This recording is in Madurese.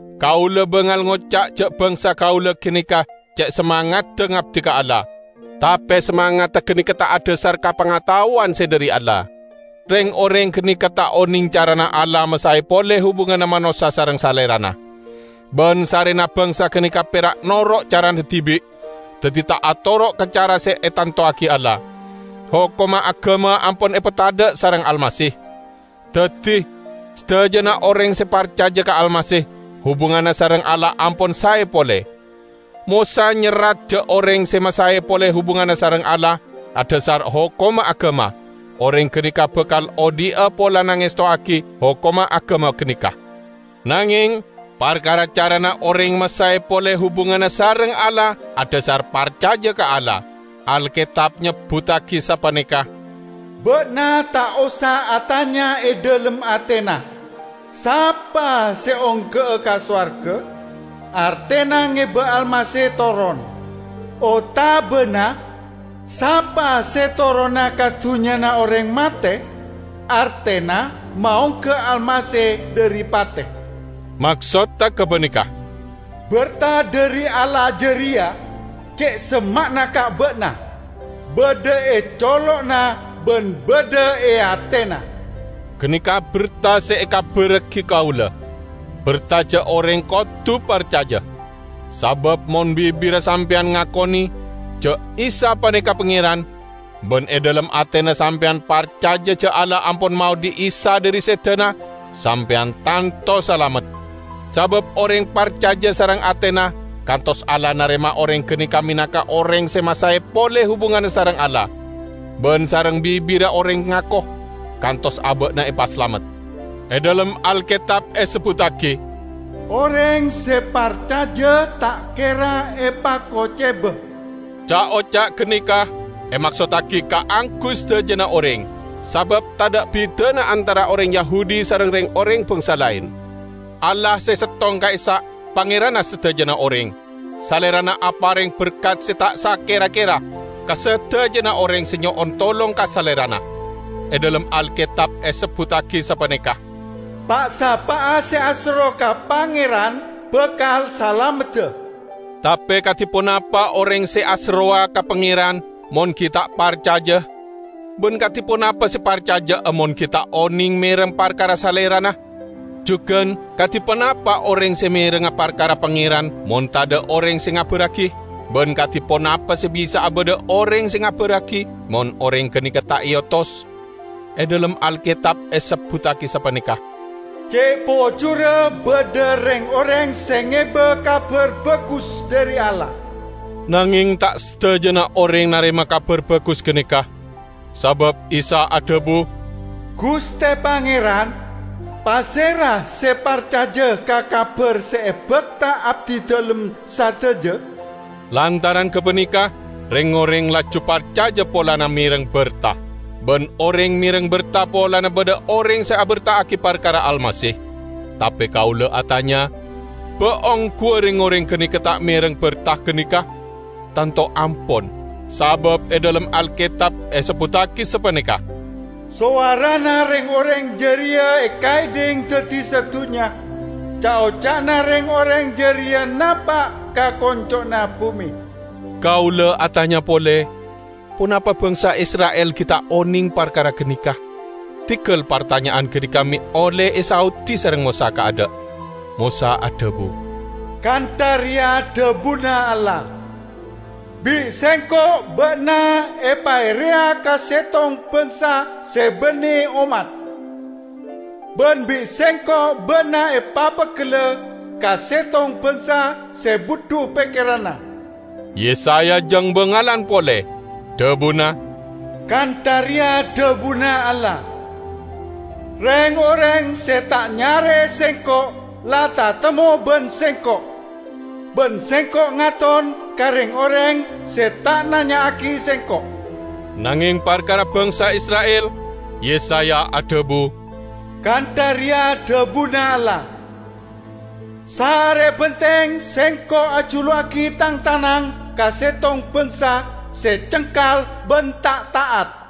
Kaula bangal ngoca' ja' bangsa kaula ganeka ce' samangadda ngabdi ka Allah; tape samangadda ganeka ta' adhasar ka pangataowan se dhari Allah. Reng-oreng ganeka ta' oneng carana Allah masae pole hubunganna manossa sareng Salerana. Ban sarrena bangsa ganeka pera' noro' carana dibi', daddi ta' atoro' ka cara se etantowagi Allah. Hokomma agama ampon epatadha' sareng Almasih. Daddi sadajana oreng se parcaja ka Almasih, hubunganna sareng Allah ampon sae pole. Mosa nyerrat ja' oreng se masae pole hubunganna sareng Allah adhasar hokomma agama, oreng ganeka bakal odhi'a polana ngestowagi hokomma agama ganeka. Nangeng, parkara carana oreng masae pole hubunganna sareng Allah adhasar parcaja ka Allah, Alketab nyebbuttagi sapaneka, "Ba'na ta' osa atanya e dhalem atena, 'Sapa se ongga'a ka sowarga?' (artena ngeba Almasih toron), otabana 'Sapa se torona ka dunnyana oreng mate?' (artena maongga Almasih dhari pate)." Maksodda gapaneka, "Berta dhari Allah jareya ce' semma'na ka ba'na; badha e colo'na ban badha e atena." Ganeka berta se ekabarragi kaula; berta ja' oreng kodu parcaja. Sabab mon bibirra sampeyan ngakone ja' "Isa paneka Pangeran", ban e dhalem atena sampeyan parcaja ja' Allah ampon maodhi' Isa dhari sedana, sampeyan tanto salamet. Sabab oreng parcaja sareng atena, kantos Allah narema oreng ganeka menangka oreng se masae pole hubunganna sareng Allah. Ban sareng bibirra oreng ngako, kantos aba'na epasalamet. E dhalem Alketab esebbuttagi, "Oreng se parcaja ta' kera epakoceba." Ca'-oca' ganeka emaksottagi kaangguy sadajana oreng, sabab tadha' bidana antara oreng Yahudi sareng reng-oreng bangsa laen. Allah se settong ka'issa' Pangeranna sadajana oreng. Salerana apareng berkat se ta' sakera-kera ka sadajana oreng se nyo'on tolong ka Salerana. E dhalem Alketab esebbuttagi sapaneka, "Pa'-sapa'a se aserro ka Pangeran, bakal salamedda." Tape kadi ponapa oreng se aserrowa ka Pangeran mon gi' ta' parcaja? Ban kadi ponapa se parcaja'a mon gi' ta' oneng mereng parkara Salerana? Jugan, kadi ponapa oreng se merengnga parkara Pangeran mon tadha' oreng se ngabarragi? Ban kadi ponapa se bisa'a badha oreng se ngabarragi mon oreng ganeka ta' eotos? E dhalem Alketab esebbuttagi sapaneka, "Ce' pojurra badha reng-oreng se ngeba Kabar Bagus dhari Allah!" Nangeng ta' sadajana oreng narema Kabar Bagus ganeka. Sabab Isa adhabu, "Guste Pangeran, pasera se parcaja ka kabar se ebakta abdidalem sadaja?" Lantaran gapaneka reng-oreng laju parcaja polana mereng berta, ban oreng mereng berta polana badha oreng se aberta'agi parkara Almasih. Tape kaula atanya: Ba' ongguwa reng-oreng ganeka ta' mereng berta ganeka? Tanto ampon! Sabab e dhalem Alketab esebbuttagi sapaneka, "Sowarana reng-oreng jareya ekaedhing daddi sadunnya, ca'-oca'na reng-oreng jareya napa' ka konco'na bume." Kaula atanya pole: Ponapa bangsa Isra'il gi' ta' oneng parkara ganeka? Diggal partanya'an ganeka me' olle esaodi sareng Mosa kaadha'. Mosa adhabu, "Kantha reya dhabuna Allah, 'Bi' Sengko' ba'na epaereya ka settong bangsa se banne ommat, ban bi' Sengko' ba'na epapeggella ka settong bangsa se budhu pekkeranna.' " Yesaya jang bangalan pole. Dhabuna, "Kantha reya dhabuna Allah, "Reng-oreng se ta' nyare'e Sengko' la tatemmo ban Sengko'; ban Sengko' ngaton ka reng-oreng se ta' nanya'agi Sengko'.' " Nangeng parkara bangsa Isra'il Yesaya adhabu, "Kantha reya dhabuna Allah, 'Saare benteng Sengko' ajuluwagi Tang tanang ka settong bangsa se cengkal ban ta' ta'at.' "